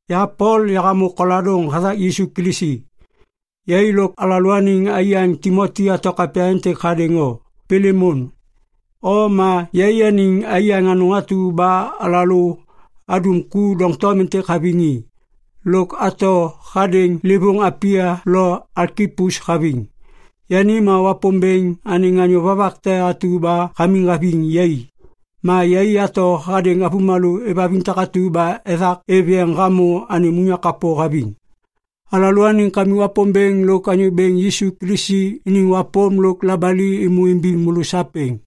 Ya Pol, yahamô koladôŋ hathak Yisu Kilisi. Yai lôk alalôaniŋ aiyaŋ Timoti ato kapya êntêk hadêŋ o, Pilemon. O ma yaianiŋ aiyaŋ anôŋ atu ba alalô adum ku doŋtom êntêk haviŋ i. Lôk ato hadêŋ livôŋ Apia lo Alkipus haviŋ. Yani ma Wapômbêŋ anêŋ anyô vovak te atu ba hamiŋ haviŋ yai. Ma yai ato hadêŋ avômalô êvhaviŋ takatu ba ethak êv yeŋ hamô anêm unyak kapô haviŋ. Alalôaniŋ Kamik Wapômbêŋ lôk Anyô Bêŋ Yisu Kilisi iniŋ wapôm lôk labali êmô imbiŋ môlô sapêŋ.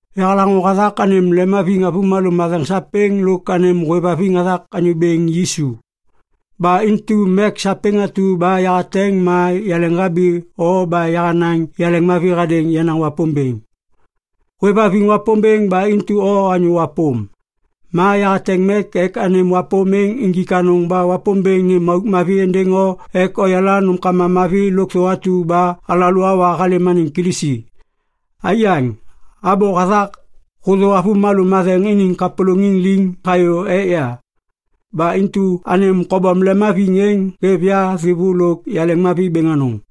Yahalaŋô hathak anêm lemhaviŋ avômalô matheŋ sapêŋ lôk anêm hôêvhaviŋ hathak Anyô Bêŋ Yisu. Ba intu mek sapêŋ atu ba yahateŋ ma yaleŋhabi o ba yahanaŋ yaleŋmavi hadêŋ yenaŋ Wapômbêŋ. Hôêvhaviŋ Wapômbêŋ ba intu o anyô wapôm. Ma yahateŋ mek ek anêm wapôm êŋ injik anôŋ ba Wapômbêŋ nêm auk mavi êndêŋ o ek oyala nômkama mavi lôkthô atu ba alalô awa halêm anêŋ Kilisi. Aiyaŋ, abô hathak hôthô avômalô matheŋ iniŋ kapôlôŋiŋ liŋ hayô ek ya. Ba intu anêm kobom lemhaviŋ êŋ hêv ya thêvô lôk yaleŋmavi bêŋ anôŋ.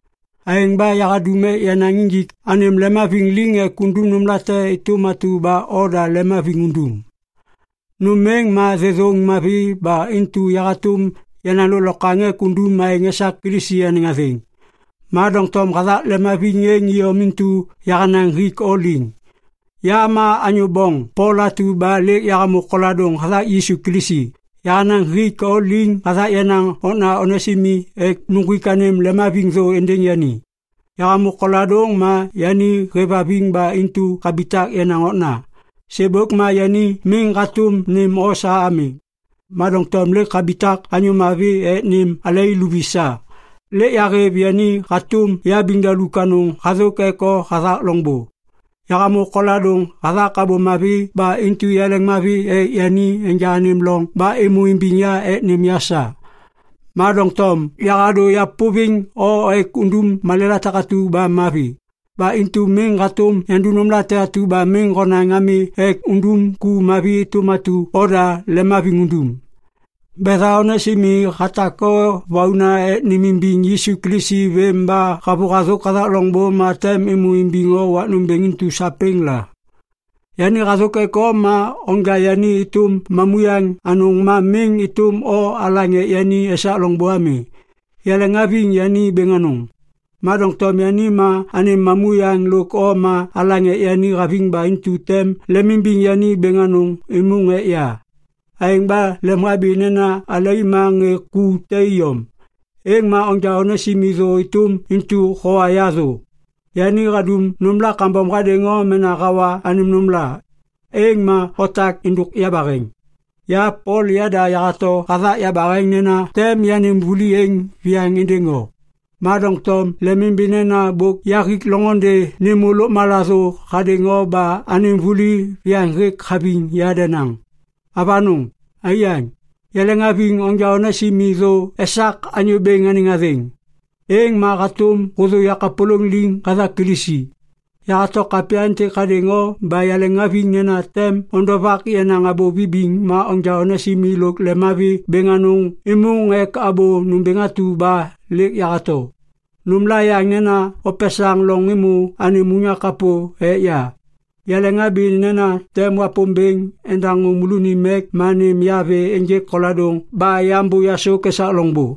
Aêŋ ba yahadum ek yanaŋ injik anêm lemhaviŋ liŋ ek undum nômlate êtôm atu ba oda lemhaviŋ undum. Nôm êŋ ma thêthôŋ mavi ba intu ya hatôm yanaŋ lôklokwaŋ ek undum aêŋ esak Kilisi anêŋ athêŋ. Ma doŋtom hathak leŋhaviŋ êŋ iyom intu yahanaŋ hik o liŋ. Ya ma anyô boŋ Pol atu ba lêk yahamô koladôŋ hathak Yisu Kilisi, yahanaŋ hik o liŋ hathak yenaŋ okna Onesimi ek nuŋgwik anêm lemhaviŋ thô êndêŋ yani. Yahamô koladôŋ ma yani hêvhaviŋ ba intu habitak yenaŋ okna. Sêbôk ma yani miŋ hatôm nêm o sa ami. Ma doŋtom lêk habitak anyô mavi ek nêm alai luvi sa. Lêk yahêv yani hatôm yabiŋdaluk anôŋ hathôk ek o hathak loŋbô. Yahamô koladôŋ hathak Abô Mavi ba intu yaleŋmavi ek yani enja anêm loŋ ba êmô imbiŋ ya ek nêm ya sa. Ma doŋtom yahadô yapôviŋ o ek undum malêla takatu ba mavi. Ba intu miŋ hatôm yandum nômlate atu ba miŋ honaŋ ami ek undum ku mavi êtôm atu oda lemhaviŋ undum. Betha Onesimi hatak o vauna ek nêmimbiŋ Yisu Kilisi vêm ba havôhathôk hathak loŋbô ma tem êmô imbiŋ o wak nômbêŋ intu sapêŋ la. Yani hathôk ek o ma onja yani êtôm mamuyaŋ anôŋ ma miŋ êtôm o alaŋ ek yani esak loŋbô ami. Yaleŋhaviŋ yani bêŋ anôŋ. Ma doŋtom yani ma anêm mamuyaŋ lôk o ma alaŋ ek yani haviŋ ba intu tem lemimbiŋ yani bêŋ anôŋ êmôŋ ek ya. Aêŋ ba lemhabi nena alai ma ŋê ku te iyom, êŋ ma onja Onesimi thô êtôm intu howa ya thô. Yani hadum nômla kambom hadêŋ o mena hawa anêm nômla, êŋ ma otak êndôk yabaheŋ. Ya Pol yada yahato hathak yabaheŋ nena tem yanêm vuli êŋ viyaŋ êndêŋ o. Ma doŋtom lemimbi nena bôk yahik loŋôndê nêmô lôkmala thô hadêŋ o ba anêm vuli viyaŋ hêk haviŋ ya denaŋ. Avanôŋ, aiyaŋ, yaleŋhaviŋ onja Onesimi thô esak Anyô Bêŋ anêŋ athêŋ. Êŋ ma hatôm hôthô yakapôlôŋ liŋ hathak Kilisi. Yahato kapya êntêk hadêŋ o ba yahêvhaviŋ nena tem ondovak yenaŋ abô vibiŋ ma onja Onesimi lôk lemmavi bêŋ anôŋ êmôŋ ek abô nômbêŋ atu ba lêk yahato. Nômla yaŋ nena opesaŋ loŋ êmô anêm unyak kapô ek ya. Yaleŋhabi nena tem Wapômbêŋ endaŋô môlônim mek ma nêm ya vê ênjêk koladôŋ ba yambô yasôk esak loŋbô.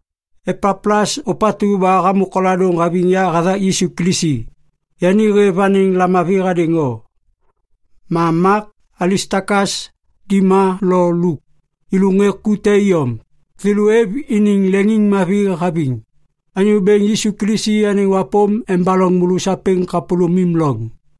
Epaplas ôpatu ba hamô koladôŋ haviŋ ya hathak Yisu Kilisi, yani hêv anêŋ lamavi hadêŋ o. Ma Mak, Alistakas, Dima lo Luk, yêlô ŋê ku te iyom, thêlô êv iniŋ leŋiŋmavi haviŋ. Anyô Bêŋ Yisu Kilisi anêŋ wapôm embaloŋ môlô sapêŋ kapôlômim loŋ.